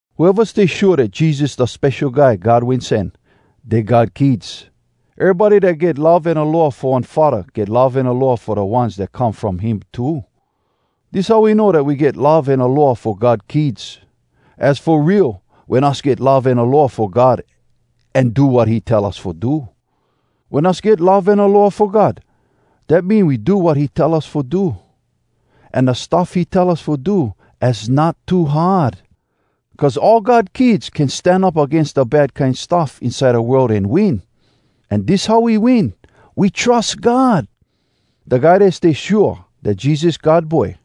Whoeva stay shua dat Jesus da Spesho Guy God Wen Sen, dey God kids. Erybody dat get love an aloha fo one faddah get love an aloha fo da ones dat come from him too. Dis how we know dat we get love an aloha fo God kids: Az fo real wen us get love an aloha fo God an do wat he tell us fo do. Wen us get love an aloha fo God, dat mean we do wat he tell us fo do. An da stuff he tell us fo do, az not too hard. Cuz all God kids can stan up agains da bad kine stuff inside da world an win. An dis how we win: We trus God! Da guy dat stay shua dat Jesus God Boy,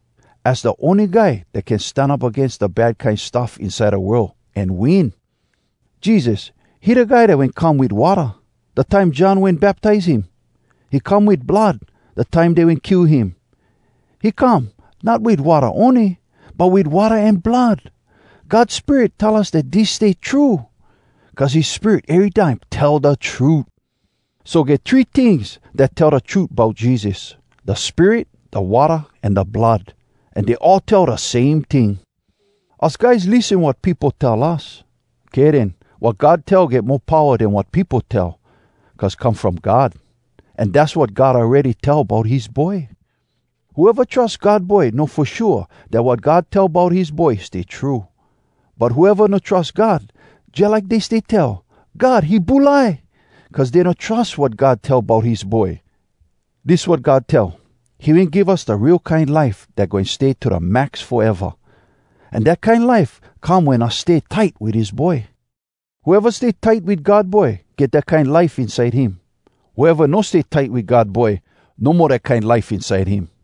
az da ony guy dat can stan up agains da bad kine stuff inside da world, an win. Jesus, he da Guy dat wen come wit watta, da time John wen baptize him. He come wit blood, da time dey wen kill him. He come, not wit watta ony, but wit watta an blood. God Spirit tell us dat dis stay true, cuz his Spirit erytime tell da trut. So, get three tings dat tell da trut bout Jesus, da Spirit, da watta, an da blood. An dey all tell da same ting. Us guys lissen wat peopo tell us. Kay den, wat God tell get mo powa den wat peopo tell, cuz come from God. An dass wat God awready tell bout his Boy. Whoeva trus God Boy know fo shua dat wat God tell bout his Boy stay true. But whoeva no trus God, jalike dey stay tell, “God, he bulai!” cuz dey no trus wat God tell bout his Boy. Dis wat God tell: he wen give us da real kine life dat goin stay to da max foeva, an dat kine life come wen us stay tight wit his Boy. Whoeva stay tight wit God Boy get dat kine life inside him. Whoeva no stay tight wit God Boy no mo dat kine life inside him.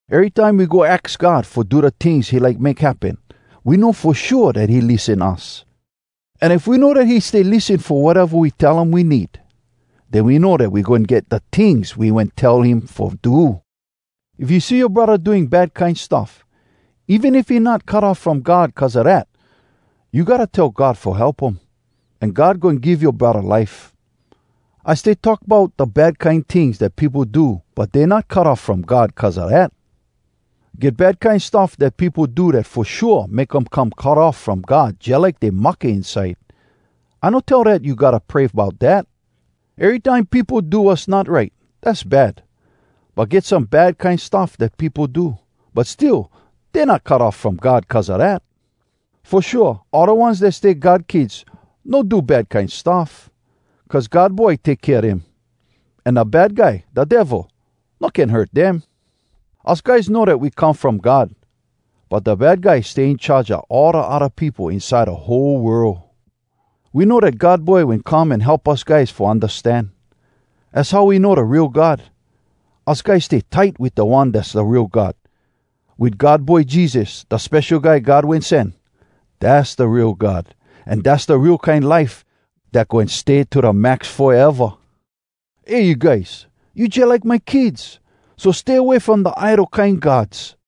Erytime we go aks God fo do da tings he like make happen, we know fo shua dat he lissen us. An if we know dat he stay lissen fo wateva we tell him we need, den we know dat we goin get da tings we wen tell him fo do. If you see yoa braddah doing bad kine stuff, even if he not cut off from God cuz a dat, you gotta tell God fo help um, an God goin give yoa braddah life! I stay talk bout da bad kine tings dat peopo do but dey not cut off from God cuz a dat. Get bad kine stuff dat peopo do dat fo shua make um come cut off from God jalike dey mahke inside—I no tell dat you gotta pray bout dat. Erytime peopo do wass not right, dass bad. But get some bad kine stuff dat peopo do, but still dey not cut off from God cuz a dat. Fo shua all da ones dat stay God kids no do bad kine stuff, cuz God Boy take kea dem, an da Bad Guy, da Devil, no can hurt dem. Us guys know dat we come from God, but da Bad Guy stay in charge a all da odda peopo inside da whole world. We know dat God Boy wen come an help us guys fo undastan. Az how we know da real God. Us guys stay tight wit da One dass da real God—wit God Boy Jesus, da Spesho Guy God Wen Sen. Dass da real God, an dass da real kine life dat goin stay to da max foeva! Eh you guys! You jalike my kids. So, stay away from da idol kine gods!